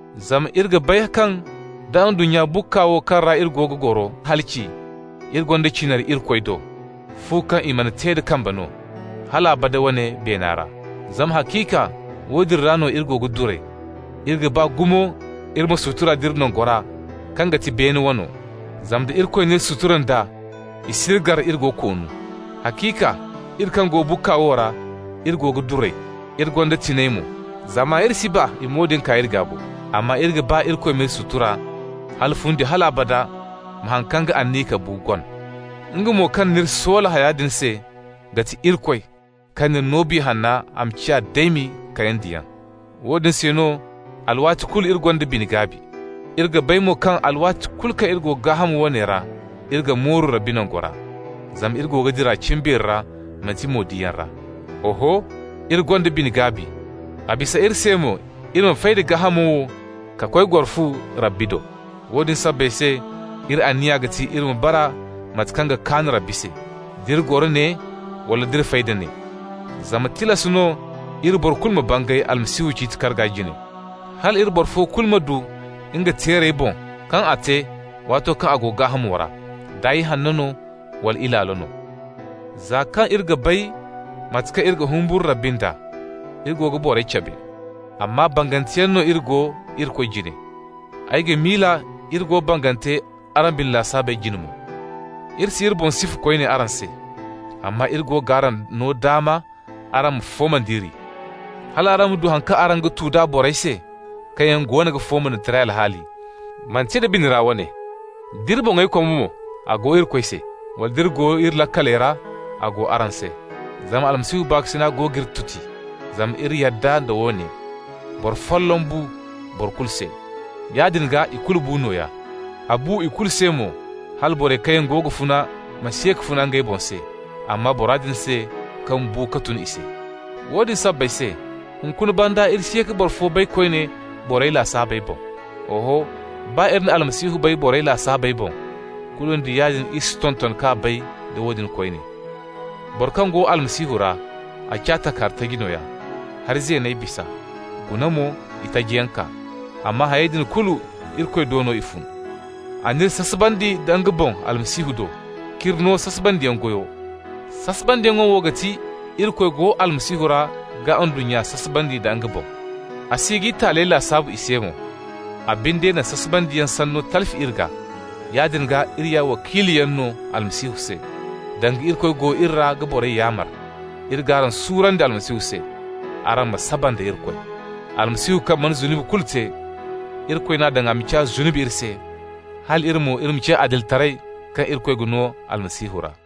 Zama iri ga bay kaŋ, da ndunnya bukka wo, kaŋ ra iri go ga goro halaci, iri gonda cinari Irikoy do, fu kaŋ i mana te da kambe no, hal abada wane beena ra. Zama haciika, woodin ra no iri go ga duray. Iri ga ba gumo iri ma sutura nd'iri nangora kaŋ ga ti beene wano. Zama da Irikoy n'iri sutura nd'a, i s'iri gar iri go koonu. Haciika, iri kaŋ go bukka wo ra, iri go ga duray, iri gonda tiŋay mo, zama iri si ba i ma woodin kaa iri gaa bo, amma iri ga ba Irikoy m'iri sutura, hala fundi hal abada ma haŋ kaŋ ga aniya ka bu gon. Nga mo kaŋ n'iri soola haya din se ga ti Irikoy, kaŋ n'iri no Biya Hanno a ma ciya daymi kayandiyaŋ. Woodin se no alwaati kulu iri gonda bine-gaabi. Iri ga bay mo kaŋ alwaati kulu kaŋ iri go gaaham woone ra, iri ga mooru Rabbi nangora. (Zama iri go ga dira cimbeeri ra, manti mo-diyaŋ ra.) Oho, iri gonda bine-gaabi. A bisa iri se mo iri ma fay da gaahamo wo ka koy goro fu Rabbi do. Woodin sabbay se, iri anniya ga ti iri ma bara mate kaŋ ga kaan Rabbi se, d'iri goro ne wala d'iri fay da ne. Zama tilas no iri boro kulu ma bangay Almasihu ciiti karga jine, hal iri boro fo kulu ma du nga teerey boŋ kaŋ a te waato kaŋ a go gaahamo ra, da ihanno no wala ilaalo no. Za kaŋ iri ga bay mate kaŋ iri ga humburu Rabbi nd'a, iri go ga borey cabe. Amma banganteyaŋ no iri go Irikoy jine. Ay ga miila iri go bangante araŋ bine lasaabey jine mo. Iri si iri boŋ sifa koyne araŋ se, amma iri go g'araŋ no daama araŋ ma fooma nd'iri, hal araŋ ma du haŋ kaŋ araŋ ga tu d'a borey se kaŋ yaŋ go ga fooma nda taray alhaali, manti nda bine ra wane. D'iri boŋey koma mo, a go Irikoy se. Wala nd'iri go iri laakaley ra, a go araŋ se. Zama Almasihu baakasina go g'iri tuti, zama iri yadda da woone: boro folloŋ bu boro kulu se, yaadin gaa ikulu bu nooya. A bu ikulu se mo hala borey kaŋ yaŋ go ga funa ma si ye ka funa ngey boŋ se, amma bora din se kaŋ bu ka tun i se. Woodin sabbay se, hunkuna banda iri si ye ka boro fo bay koyne borey lasaabey boŋ. Oho, baa iri na Almasihu bay borey lasaabey boŋ, kulu nda yaadin iri si tonton k'a bay da woodin koyne. Boro kaŋ go Almasihu ra, a ciya takahari taji nooya. Hari zeeney bisa, guna mo, itajiyaŋ kaa. Amma hayey din kulu, Irikoy do no i fun. A n'iri sasabandi nda nga boŋ Almasihu do, k'iri no sasabandiyaŋ goyo. Sasabandiyaŋo wo ga ti: Irikoy go Almasihu ra ga ndunnya sasabandi nda nga boŋ, a si g'i taaley lasaabu i se mo. A binde na sasabandiyaŋ sanno talfi iri gaa. Yaadin gaa, iri ya wakiiluyaŋ no Almasihu se, danga Irikoy go iri ra ga borey yaamar. Iri g'araŋ suurandi Almasihu se: «Araŋ ma saba nda Irikoy!» Almasihu kaŋ mana zunubi kulu te, Irikoy n'a daŋ a ma ciya zunubi iri se, hal iri mo, iri ma ciya adilitaray kaŋ Irikoy ga no Almasihu ra.